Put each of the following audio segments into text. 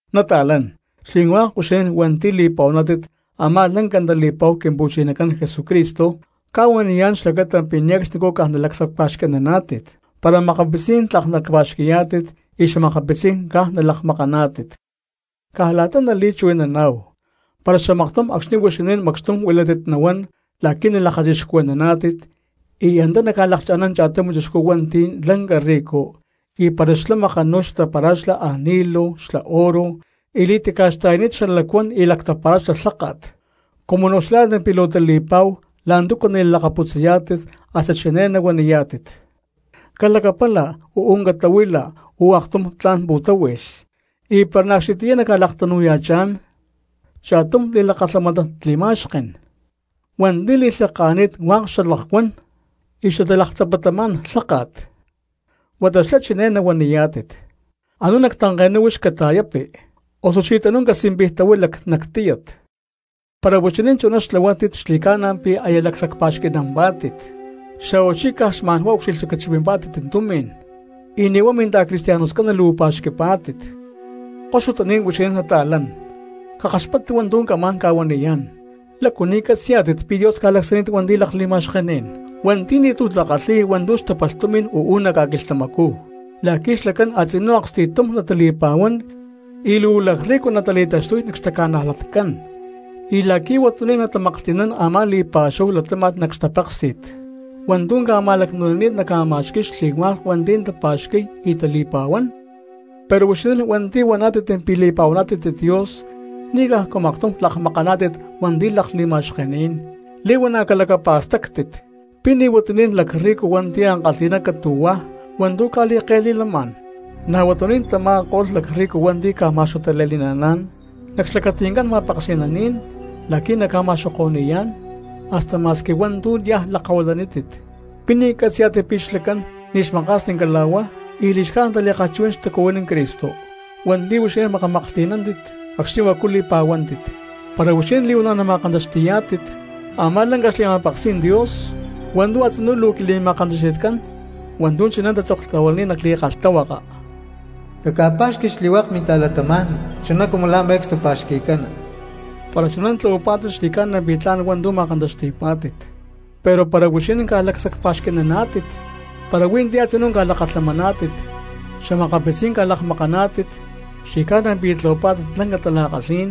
Nata̠lán, xli̠hua̠k huixinín hua̠nti̠ li̠pa̠huaná̠tit a̠má lanca tali̠pa̠hu Quimpu̠chinacán Jesucristo, cca̠huaniyá̠n xlacata pi̠ ne̠cxnicú caj nalacsacpa̠xqui̠naná̠tit para makapitzí̠n tlak naca̠pa̠xqui̠yá̠tit y xa̠makapitzí̠n caj nalakmakaná̠tit. Caj la̠ta nali̠chuhui̠naná̠hu, para xamaktum acxni̠ huixinín macxtum huilátit nahuán la̠qui̠ nalakachixcuhui̠yá̠tit y antá naca̠lakcha̠ná̠n cha̠tum chixcú hua̠nti̠ lanca rico, y para xlá makanu̠y xatapara̠xlá ani̠lu xla oro y li̠taca̠xta̠yani̠t xalacuán y lactapara̠xlá lháka̠t, cumu naucxilhá̠tit pi̠ luu tali̠pa̠hu la̠ntúcu nali̠lakaputzayá̠tit, hasta chiné nahuaniyá̠tit: “Calacapala, uú catahuila, huí aktum tla̠n pu̠táhui̠lh.” Y para na̠ acxnitiyá naca̠laktanu̠ya̠chá̠n cha̠tum li̠lakalhamánat li̠ma̠xken hua̠nti̠ li̠lhaka̠nani̠t hua̠k xalakuán y xatalaktzapatamá̠n lháka̠t, huata xlá chiné nahuaniyá̠tit: “Anú nac tanke̠nú huix cata̠yápi, osuchí tanú casimpijtahuila nac tíyat.” Para huixinín chuná xtlahuátit xli̠ca̠na pi̠ aya lacsacpa̠xqui̠nampá̠tit, xa̠huachí caj xma̠nhuá ucxilhlacachipimpá̠tit tumi̠n y ni̠ huá minta̠cristianoscán luu pa̠xqui̠pá̠tit. Koxutaní̠n huixinín nata̠lán, cakaxpáttit hua̠ntu̠ camá̠n ca̠huaniyá̠n: ¿lácu ni̠ catzi̠yá̠tit pi̠ Dios ca̠lacsacni̠t hua̠nti̠ lakli̠ma̠xkení̠n hua̠nti̠ ni̠ti̠ takalhi̠y hua̠ntu̠ xtapalh tumi̠n uú nac ca̠quilhtamacú la̠qui̠ xlacán a̠tzinú aksti̠tum natali̠pa̠huán y luu lacrrico natali̠taxtuy xtaca̠najlatcán, y la̠qui̠ huatuní̠n natamaklhti̠nán a̠má li̠pa̠xúhu latáma̠t nac xtapéksi̠t hua̠ntu̠ ca̠ma̠lacnu̠nini̠t naca̠ma̠xqui̠y xli̠hua̠k hua̠nti̠ tapa̠xqui̠y y tali̠pa̠huán? Pero huixinín hua̠nti̠ huaná̠tit pi̠ li̠pa̠huaná̠tit Dios ni̠ cajcu maktum lakmakaná̠tit hua̠nti̠ lakli̠ma̠xkení̠n. Li̠huana̠ calacapa̠stactit, ¿pi̠ ni̠ huatuní̠n lacrrico hua̠nti̠ ankalhi̠ná catu̠huá hua̠ntu̠ ca̠li̠ke̠li̠lamá̠n, na̠ huatuní̠n tama̠ko̠lh lacrrico hua̠nti̠ ca̠ma̠xuatale̠ni̠naná̠n nac xlacati̠ncán ma̠peksi̠naní̠n la̠qui̠ naca̠ma̠xoko̠ni̠yá̠n hasta ma̠squi hua̠ntu̠ niaj lakahuilanítit? ¿Pi̠ ni̠ catzi̠yá̠tit pi̠ xlacán ni̠ xmaka̠sni cala̠huá y li̠xcájnit tali̠kalhchuhui̠nán xtacuhuiní Cristo hua̠nti̠ huixinín makamaklhti̠nántit acxni̠ huacu li̠pa̠huántit? Para huixinín li̠huana̠ nama̠kantaxti̠yá̠tit a̠má lanca xli̠ma̠peksí̠n Dios hua̠ntu̠ a̠tzinú luu quili̠ma̠kantaxti̠tcán hua̠ntu̠ chiné tatzoktahuilani̠t nac li̠kalhtahuaka: “Caca̠pa̠xqui xli̠hua̠k minta̠cristianos chuná cumu la̠ me̠cstu pa̠xqui̠cana.” Para chuná tlahuapá̠tit xli̠ca̠na pi̠ tla̠n hua̠ntu̠ ma̠kantaxti̠pá̠tit. Pero para huixinín caj lacsacpa̠xqui̠naná̠tit para hui̠ntí a̠tzinú ca̠lakalhamaná̠tit, xa̠makapitzí̠n ca̠lakmakaná̠tit, xli̠ca̠na pi̠ tlahuapá̠tit lanca tala̠kalhí̠n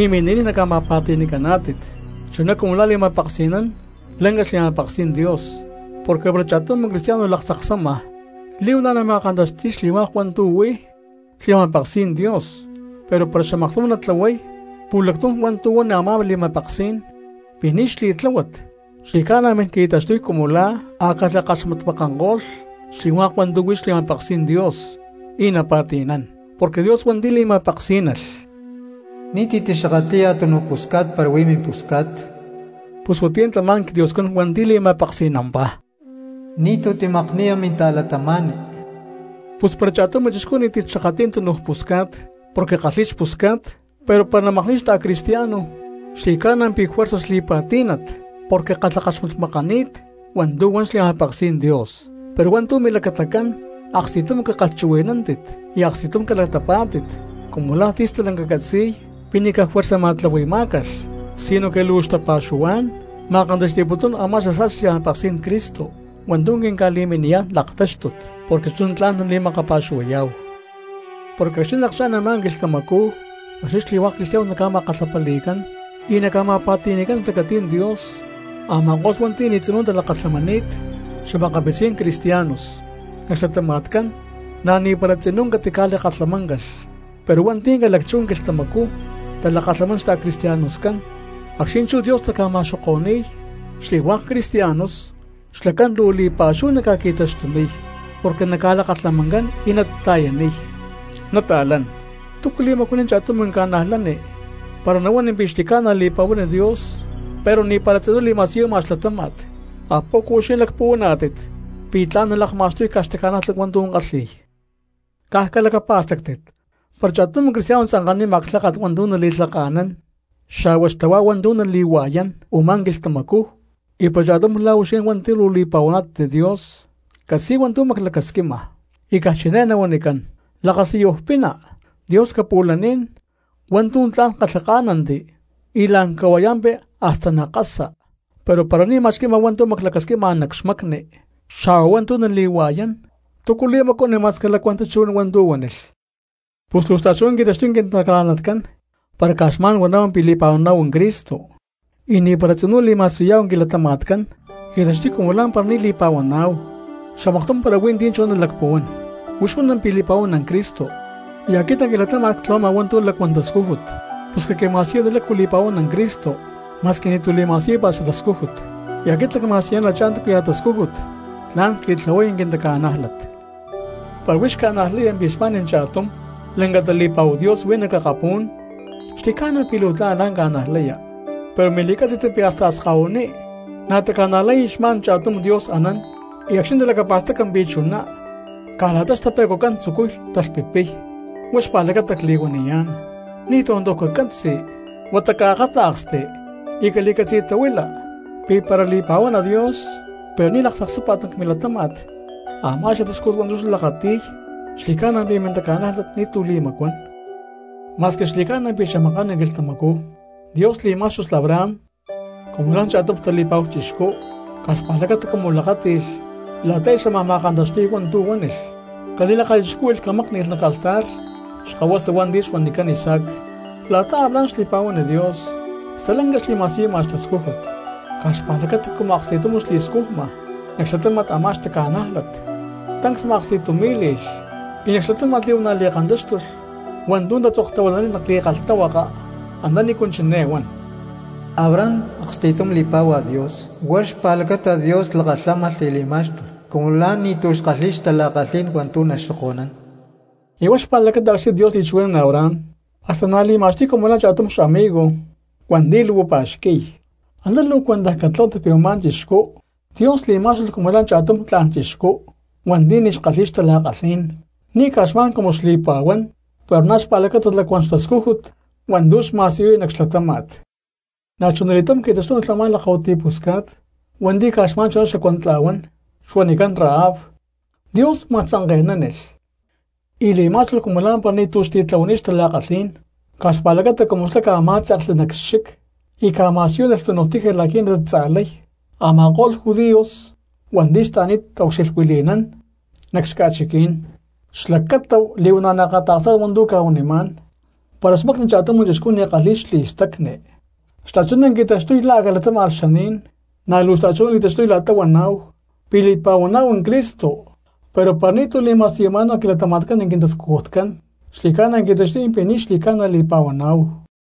y mini̠niy naca̠ma̠pa̠ti̠ni̠caná̠tit chuná cumu la̠ li̠ma̠peksi̠nán lanca xli̠ma̠peksí̠n Dios. Porque para cha̠tum cristiano laktzaksama li̠huana̠ nama̠kantaxti̠y xli̠hua̠k hua̠ntu̠ huí xli̠ma̠peksí̠n Dios pero para xamaktum natlahuay pu̠lactum hua̠ntu̠ huan a̠má li̠ma̠peksí̠n pi̠ ni̠ xli̠tláhuat, xli̠ca̠na min qui̠taxtuy cumu la̠ a̠ cakalhakaxmatmakanko̠lh xli̠hua̠k hua̠ntu̠ huí xli̠ma̠peksí̠n Dios y napa̠ti̠nán. Porque Dios hua̠nti̠ li̠ma̠peksí̠nalh: “Ni̠ti̠ tixakatli̠ya túnuj pusca̠t para huí mimpusca̠t”, pus huatiyá tamá quiDioscán hua̠nti̠ li̠ma̠peksi̠nampá: “Ni̠tú timakni̠ya minta̠cristiano.” Pus para cha̠tum cristiano ni̠ti̠ xakatli̠y túnuj pusca̠t porque kalhi̠y xpusca̠t, pero para namakni̠y xta̠cristiano xli̠ca̠na pi̠ juerza xli̠pa̠tí̠nat porque kalhakaxmakani̠t hua̠ntu̠ huán xli̠ma̠peksí̠n Dios. Pero hua̠ntu̠ milacatacán, aksti̠tum cakalhchuhui̠nántit y aksti̠tum calatapá̠tit cumu la̠ ti̠ stalanca catzi̠y pi̠ ni̠ caj juerza ma̠tlahui̠má̠calh sinoque luu xtapa̠xuhuá̠n ma̠kantaxti̠putún a̠má xasa̠sti xli̠ma̠peksí̠n Cristo hua̠ntu̠ quinca̠li̠miniyá̠n laktáxtut, porque chuná tla̠n nali̠makapa̠xuhuayá̠hu. Porque acxni̠ nalakchá̠n a̠má quilhtamacú acxni̠ xli̠hua̠k cristianos naca̠ma̠kalhapali̠cán y naca̠ma̠pa̠ti̠ni̠cán nac xlacatí̠n Dios, a̠ma̠ko̠lh hua̠nti̠ ni̠ tzinú talakalhamani̠t xa̠makapitzí̠n cristianos nac xlatama̠tcán na̠ ni̠para tzinú catica̠lakalhamáncalh; pero hua̠nti̠ ca̠lacchú quilhtamacú talakalhamán xta̠cristianoscán, acxni̠ chú Dios naca̠ma̠xoko̠ni̠y xli̠hua̠k cristianos xlacán luu li̠pa̠xúhu naca̠qui̠taxtuniy porque na̠ naca̠lakalhamancán y natata̠yaniy. Nata̠lán, ¿túcu li̠macuaniy cha̠tum cristiano para nahuán pi̠ xli̠ca̠na li̠pa̠huán Dios pero ni̠para tzinú li̠ma̠siyuma xlatáma̠t? ¿Apoco huixinín lacpuhuaná̠tit pi̠ tla̠n nalakma̠xtuy caj xtaca̠nájlat hua̠ntu̠ kalhi̠y? Caj calacapa̠stáctit: para cha̠tum cristiano tzanka̠nima clháka̠t hua̠ntu̠ nali̠lhaka̠nán xa̠hua xtahuá hua̠ntu̠ nali̠hua̠yán u̠má quilhtamacú, y para cha̠tum la̠ huixinín hua̠nti̠ luu li̠pa̠huaná̠tit Dios catzi̠y hua̠ntu̠ maclacasquima y caj chiné nahuanicán: “Lakasiyuj pina, Dios capu̠laní̠n. Hua̠ntu̠ tla̠n calhaka̠nántit y la̠n cahua̠yampi hasta nakasa”, pero para ni̠ ma̠xqui̠ma hua̠ntu̠ maclacasquima nac xmacni xa̠hua hua̠ntu̠ nali̠hua̠yán, ¿túcu li̠macuaniy ma̠squi lacuán tachuhuí̠n hua̠ntu̠ huánilh? Pus luu xta̠chuná qui̠taxtuy quintaca̠najlatcán para caj xma̠n huaná̠hu pi̠ li̠pa̠huaná̠hu Cristo y ni̠para tzinú li̠ma̠siyuyá̠hu quilatama̠tcán, qui̠taxtuy cumu lá̠mpara ni̠ li̠pa̠huaná̠hu. Xamaktum para huí ti̠ chuná nalacpuhuán: “Huix huana pi̠ li̠pa̠huana Cristo, y aquit nac quilatáma̠t ctlahuama hua̠ntu̠ lacuán tascújut.” Pus caquima̠siyuni lácu li̠pa̠huana Cristo ma̠squi ni̠ti̠ li̠ma̠siyúpa̠t xatascújut, y aquit nacma̠siyuniyá̠n la̠tachá túcuya̠ tascújut tla̠n cli̠tlahuay quintaca̠nájlat. Para huix ca̠najlaya pi̠ xma̠n cha̠tum lanca tali̠pa̠hu Dios huí nac akapú̠n, xli̠ca̠na pi̠ luu tla̠n la̠ta ca̠najlaya; pero mili̠cátzi̠t pi̠ hasta akskahuiní̠ na̠ taca̠najlay xma̠n cha̠tum Dios anán y acxni̠ talacapa̠staca pi̠ chuná caj la̠ta xtape̠cuacán tzucuy talhpipixni̠y. Huá xpa̠lacata cli̠huaniyá̠n, ni̠ tontoj cacatzi huata caakáta̠ksti y cali̠catzi̠tahuila pi̠ para li̠pa̠huana Dios pero ni̠ laktzaksápa̠t nac milatáma̠t a̠má xatascújut hua̠ntu̠ xlá lakati̠y, xli̠ca̠na pi̠ mintaca̠nájlat ni̠ti̠ li̠macuán. Ma̠squi xli̠ca̠na pi̠ xamaká̠n quilhtamacú Dios li̠má̠xtulh Abraham cumu la̠ cha̠tum tali̠pa̠hu chixcú caj xpa̠lacata cumu lakáti̠lh la̠ta aya xámaj ma̠kantaxti̠y hua̠ntu̠ huánilh cali̠lakachixcúhui̠lh camákni̠lh nac altar xkahuasa hua̠nti̠ xuanicán Isaac. La̠ta Abraham xli̠pa̠huán Dios stalanca xli̠ma̠siyuma xtascújut, caj xpa̠lacata cumu aksti̠tum xli̠scujma nac xlatáma̠t a̠má xtaca̠nájlat tancs ma̠aksti̠tumí̠li̠lh. Y nac xlatáma̠t li̠huana̠ li̠kantáxtulh hua̠ntu̠ tatzoktahuilani̠t nac li̠kalhtahuaka antanícu chiné huan: “Abraham aksti̠tum li̠pá̠hua Dios huá xpa̠lacata Dios lakalhámalh y li̠má̠xtulh cumu la̠ ni̠ti̠ xkalhi̠y xtala̠kalhí̠n wa̠ntu̠ naxoko̠nún.” Y huá xpa̠lacata acxni̠ Dios li̠chuhui̠nán Abraham hasta na̠ li̠ma̠xtuy cumu la̠ cha̠tum xa̠migo hua̠nti̠ luu xpa̠xqui̠y. Antá luu cuentaj catlahuátit pi̠ u̠má chixcú Dios li̠má̠xtulh cumu la̠ cha̠tum tla̠n chixcú hua̠nti̠ ni̠ xkalhi̠y xtala̠kalhí̠n, ni̠ caj xma̠n cumu xli̠pa̠huán pero na̠ xpa̠lacata lacuán xtascújut hua̠ntu̠ xma̠siyuy nac xlatáma̠t. Na̠chuna li̠túm qui̠taxtúnilh a̠má lakahuiti pusca̠t hua̠nti̠ caj xma̠n chuná xacuantla̠huán xuanicán Rahab, Dios ma̠tzanke̠nánilh y li̠má̠xtulh cumu lá̠mpara ni̠ti̠ xtitlahuani̠t xtala̠kalhí̠n caj xpa̠lacata cumu xlá ca̠má̠tze̠kli nac xchic y ca̠ma̠siyúnilh túnuj tiji la̠qui̠ natatza̠lay a̠ma̠ko̠lh judíos hua̠nti̠ xtaani̠t taucxilhuili̠nán nac xca̠chiquí̠n. Xlacata li̠huana̠ naakata̠ksá̠tit hua̠ntu̠ cca̠huanimá̠n, para xmacni cha̠tum chixcú ni̠ kalhi̠y xli̠stacni xta̠chuná qui̠taxtuy la̠ a̠ calatáma̠lh xaní̠n, na̠ luu xta̠chuná li̠taxtuy la̠ta huaná̠hu pi̠ li̠pa̠huaná̠hu Cristo pero para ni̠ti̠ li̠ma̠siyuma̠náhu nac quilatama̠tcán quintascujutcán xli̠ca̠na qui̠taxtuy pi̠ ni̠ xli̠ca̠na li̠pa̠huaná̠hu.